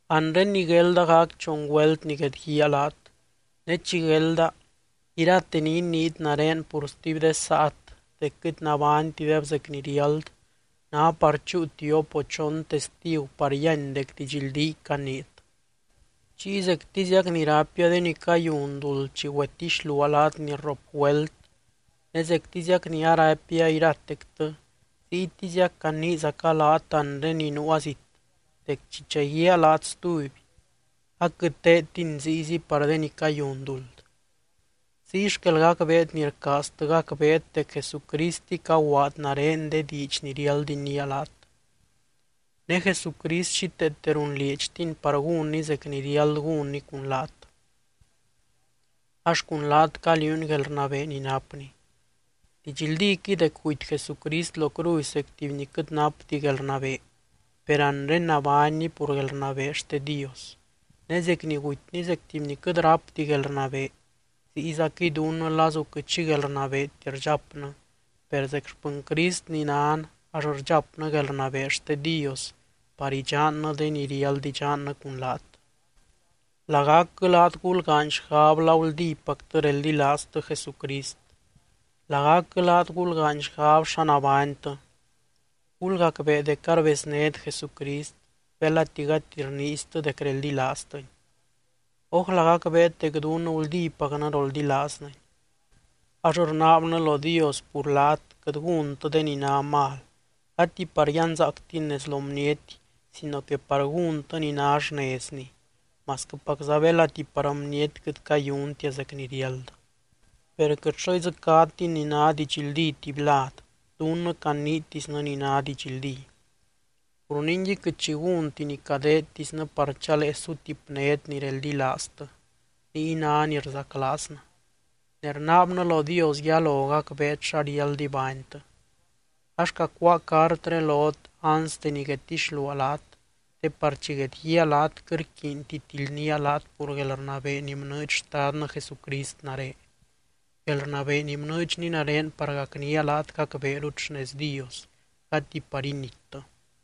Anre ni guelda gac chon güelt ni guedguíaa laat. Ne chi guelda, irate ni iniit nare pur stuby de saat dec quɨt nabánytideb zec ni riáld, ná par chúu tiop o chon testigu par yíany dec didxldíy caniit. Chiy zectiziac ni raipia de ni cayun duld chi güetixluaa laat ni rrop güelt ne zectiziac ni araipia iratectɨ, ziytiziac caniizaca laat anre ni nuua zit dec chi chaguíaa laat stuby, aquɨt teedtini ziyzi par de ni cayun duld. Ziy xquel gacbeet ni rcaaztɨ gacbeet dec Jesucristɨy caguaad nare de diidx ni riáld iniia laat. Ne Jesucrist xíteete runlieedxtiny par gúnny zec ni riáld gúnny cun laat, ax cun laat caliuuny guelrnabee ni napny. Didxldíquɨy dec guty Jesucrist lo cruzy zec tuby ni quɨt napti guelrnabee, per anre nabánny pur guelrnabee xte Dios. Ne zec ni gutyny zec tuby ni quɨt rápti guelrnabee ziyzaquɨy dunnɨ lazu quɨt xi guelrnabeeti rdxapnɨ, per zec xpɨny Crist ni nan ax rdxapnɨ guelrnabee xte Dios par idxannɨ de ni riáld idxannɨ cun laat. Lagacquɨ laat gulgaany xgab la guldípactɨ reldilaaztɨ Jesucrist. Lagacquɨ laat gulgaany xgab xa nabánytɨ. Gulgacbee dec arbeznét Jesucrist, belati gati rniiztɨ dec reldilaaztɨny. Ójla gacbeet dec dunnɨ guldípacnɨ roldilaaznɨny. Ax rnaabnɨ lo Dios pur laat quɨt gúntɨ de ni ná mal, gati par yanzaactin nez lo bniety sino que par gúntɨ ni ná xnezni, masquɨpacza belati par bniety quɨt cayuntia zec ni riáld. Per quɨt xo idzɨcátin ni ná didxldí tuby lad, dunnɨ caniitisnɨ ni ná didxldí. Pur ningui quɨt xi gúnti ni cadeedtisnɨ par chalee sutipnét ni reldilaaztɨ, niy ná ni rzaclaaznɨ. Ne rnaabnɨ lo Dios yalo gacbeet xa riáld ibánytɨ. Ax cacuáa cartré lot anste ni guedtixluaa laat, te par chi guedguíaa laat quɨt rquiinti tildnía laat pur guelrnabee ni bnɨɨdx Xtadnɨ Jesucrist nare, guelrnabee ni bnɨɨdxny nare par gacnía laat gacbeerut xnez Dios, gati par inittɨ.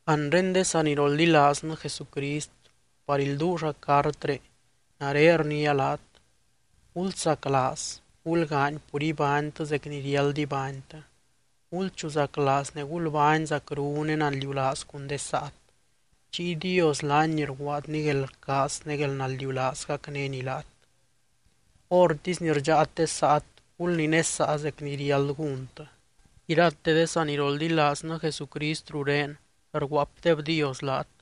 Anre de saniroldilaaznɨ Jesucrist par ilduulla cartré, nare rniia laat: Gulsaclaaz, gulgaany pur ibánytɨ zec ni riáld ibánytɨ, gulchuzaclaaz ne gulbány zacru ne naldiulaaz cun de saat. Chiy Dios laany ni rguaadny guelrcaaz ne guelnaldiulaaz gacnény laat. Hórtisy ni rdxáat de saat, gulninesaa zec ni riáld gúntɨ. Irate de saniroldilaaznɨ Jesucrist rurén rguaapdebdios laat.